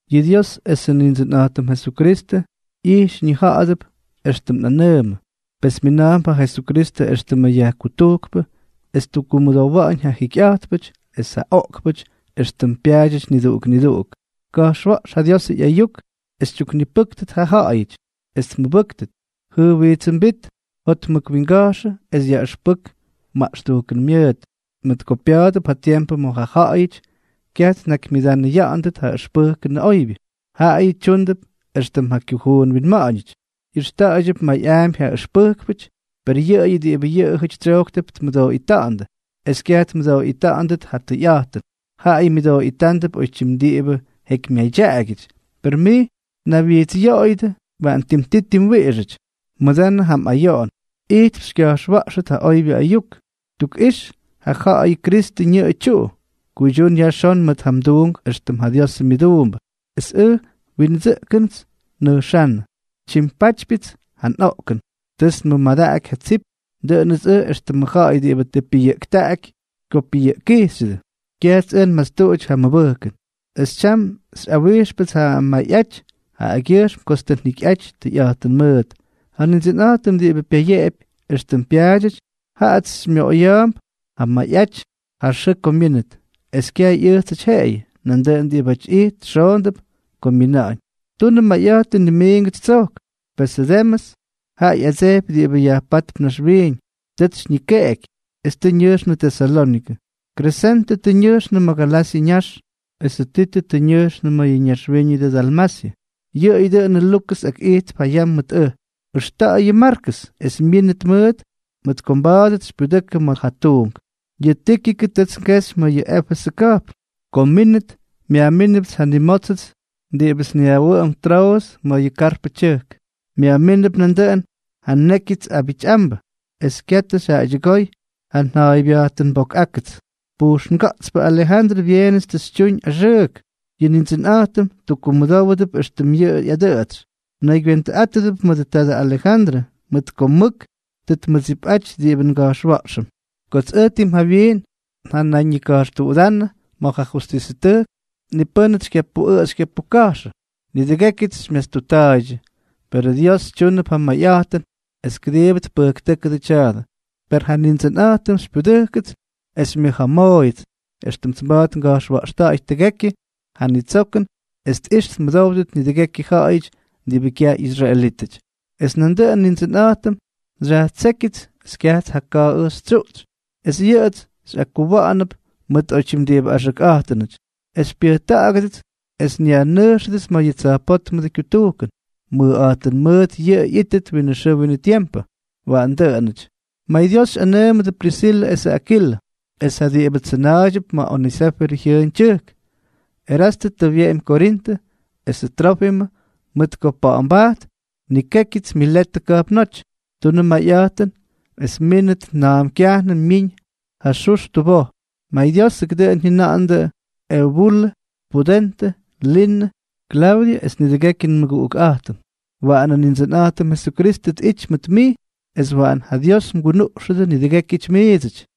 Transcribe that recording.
Yʉ Dios esʉ Nindsʉnꞌa̱jtʉm Jesukristʉ ꞌyijx ñija̱ꞌa̱dʉp éxtʉm nꞌanʉʉmʉ. Pes mina̱a̱mp ja Jesukristʉ éxtʉmʉ yajkutujkpʉ es ttukkumʉdowa̱ꞌa̱ñ ja jikyꞌa̱jtpʉty es ja oꞌkpʉty éxtʉm pyaadyʉty niduꞌuk niduꞌuk. Ka̱jxwa̱ꞌx ja Diosʉ ꞌyayuk es xytyuknipʉ́ktʉt ja ja̱ꞌa̱yʉty es tmʉbʉ́ktʉt, jʉjwijtsʉmbít, jotmʉkwinga̱jxʉ es yaꞌʉxpʉk maꞌxtujkʉn myʉʉt. Mʉt ko pya̱a̱dʉp ja tiempʉ ma̱ ja ja̱ꞌa̱yʉty kyaj tnakymyʉdanʉya̱ꞌa̱ndʉt ja ʉxpʉjkʉnʉ oybyʉ; jaꞌayʉ tyúndʉp éxtʉm ja kyujuun winma̱ꞌa̱ñʉty, ꞌyʉxta̱ꞌa̱ydyʉp mayꞌaampy ja yaꞌʉxpʉjkpʉty, per yʉꞌʉyʉ diꞌibʉ yʉꞌʉjʉty tsyojktʉp tmʉdooꞌita̱ꞌa̱ndʉ, es kyaj tmʉdooꞌita̱ꞌa̱ndʉt ja tʉyꞌa̱jtʉn, jaꞌayʉ myʉdooꞌita̱ꞌa̱ndʉp oytyim diꞌibʉ jekymyadyaꞌagyʉty. Per mij, naywyijtsꞌyoꞌoyʉdʉ, waꞌan ttimti ttimwiꞌixʉty. Mʉdanʉ ja mꞌayoꞌon. Ijtp xykya̱jxwa̱ꞌxʉt ja oybyʉ ayuk. Tukꞌix ja ja̱ꞌa̱yʉ Kristʉ ñʉꞌʉ tyuꞌu. Kuydyún yajxón mʉt ja mduunk éxtʉm ja Diosʉ myʉduumbʉ. Es ʉj, windsʉꞌkʉnts nnʉjxánnʉ, tyimpátypyʉts ja nꞌoꞌkʉn. Tʉts nmʉmadaꞌaky ja tsip. Dʉꞌʉnʉts ʉj éxtʉmʉ ja̱ꞌa̱y diꞌibʉ tʉ pyʉyʉꞌkja̱ꞌty ko pyʉyʉꞌkkijxyʉdʉ. Kyajts ʉj nmastuꞌuty ja mʉbʉjkʉn. Es tyam xyꞌawijxpʉts ja mayꞌaty jaꞌagyʉjxm kots tʉ njikyꞌaty tʉyꞌa̱jtʉn mʉʉt. Ja Nindsʉnꞌa̱jtʉm diꞌibʉ pyayeꞌepy éxtʉm pyaadyʉty, jaꞌats xymyoꞌoya̱a̱mp ja mayꞌaty ja xʉʉ ko myínʉt. Es kyaj ꞌyʉjtsʉty jeꞌeyʉ, nandʉꞌʉn diꞌibáty ijt xoondʉp ko myina̱ꞌa̱ñ. Tunʉ mayꞌa̱jtʉn nimiingʉts tsojk. Pesʉ Demʉs, jaꞌa ꞌyadsejpy diꞌibʉ yajpátp naxwiiñ, tʉts xyñikeꞌeky es tʉ ñʉjxnʉ Tesalónikʉ. Kresentʉ tʉ ñʉjxnʉ ma̱ Galasyʉ ñax, esʉ Titʉ tʉ ñʉjxnʉ ma̱ yʉ ñaxwíñʉdʉ Dalmasyʉ. Yʉꞌʉyʉ dʉꞌʉnʉ Lukʉs akꞌijtp ja yam mʉt ʉj. Ʉxta̱ꞌa̱y yʉ Markʉs es mmínʉt mʉʉt, mʉt ko mba̱a̱dʉts xypyudʉkʉ ma̱ ja tuunk. Yʉ Tíkikʉ tʉts ngexy ma̱ yʉ Éfesʉ ka̱jpn. Ko mmínʉt, myajmínʉpts ja nnimótsʉts diꞌibʉts nyajwʉꞌʉm Troʉs ma̱ yʉ Karpʉ tyʉjk; myajmínʉp nandʉꞌʉn ja nnékyʉts abityꞌambʉ, es katʉ xyjaydyʉgoy ja nja̱a̱ybyajtʉnboꞌoꞌák. Pujxnga̱ꞌtspʉ Alejandrʉ byeenʉts tʉ xytyuñ axʉʉk. Yʉ Nindsʉnꞌa̱jtʉm tukkumʉdówʉdʉp éxtʉm tʉ ꞌyadʉꞌʉtsy. Mnaygywentʉꞌátʉdʉp mʉdʉ tadʉ Alejandrʉ, mʉt ko mʉk tʉ tmʉdsipꞌaty diꞌibʉ nga̱jxwa̱ꞌxʉm. Kots ʉj tim jawyiin njanayñika̱jxtuꞌudánʉ ma̱ ja justisʉtʉjk, ni pʉ́nʉts xykyapuꞌʉꞌʉ xykyapuka̱jxʉ. Nidʉgékyʉts xymyastutta̱a̱ydyʉ. Perʉ Dios tyúnʉp ja mayꞌa̱jtʉn es kʉdiibʉ tpʉjktʉ́kʉdʉ tya̱a̱dʉ. Per ja Nindsʉnꞌa̱jtʉm xypyudʉjkʉts es xymyʉja̱a̱mooyʉts, éxtʉmts mba̱a̱t nga̱jxwa̱ꞌxta̱ꞌa̱y tʉgekyʉ ja nitsokʉn es tꞌix tmʉdówdʉt nidʉgekyʉ ja̱ꞌa̱yʉty diꞌibʉ kyaj ꞌyisraelítʉty. Es dʉꞌʉnʉ Nindsʉnꞌa̱jtʉm xyajtsékyʉts es kyajts ja ka̱a̱ ʉj xytsyuꞌtsy, es yʉꞌʉts xyꞌakkuwa̱ꞌa̱nʉp mʉt oytyim diꞌibʉ axʉkꞌa̱jtʉnʉty, es xypyʉjkʉꞌʉgʉdʉts es xyajnʉjxʉdʉts ma̱ yʉ tsa̱jpótmʉdʉ kyutujkʉn. Mʉjꞌa̱jtʉn mʉʉt yʉꞌʉ ꞌyítʉt winʉ xʉʉ winʉ tiempʉ. Waꞌan dʉꞌʉnʉty. MayDios xyꞌanʉʉmʉdʉ Prisilʉ esʉ Akilʉ, es ja diꞌibʉ tsʉna̱a̱ydyʉp ma̱ ja Onesífʉrʉ jyʉʉn tyʉjk. Erastʉ tʉ wyeꞌemy Korintʉ; esʉ Trófimʉ, mʉt ko pa̱ꞌa̱mbajt, nnikékyʉts Miletʉ ka̱jpnóty. Tunʉ mayꞌa̱jtʉn es mmínʉt na̱a̱m kyajnʉm myiñ ja xux tuboj. MayDiósʉkʉ dʉꞌʉn jyʉna̱ꞌa̱ndʉ Eubulʉ, Pudentʉ, Linʉ, Klaudyʉ es nidʉgekyʉ nmʉguꞌukꞌa̱jtʉm. Waꞌanʉ Nindsʉnꞌa̱jtʉm Jesukristʉ tꞌity mʉt mij, es waꞌan ja Dios mgunuꞌxʉdʉ nidʉgékyʉty miidsʉty.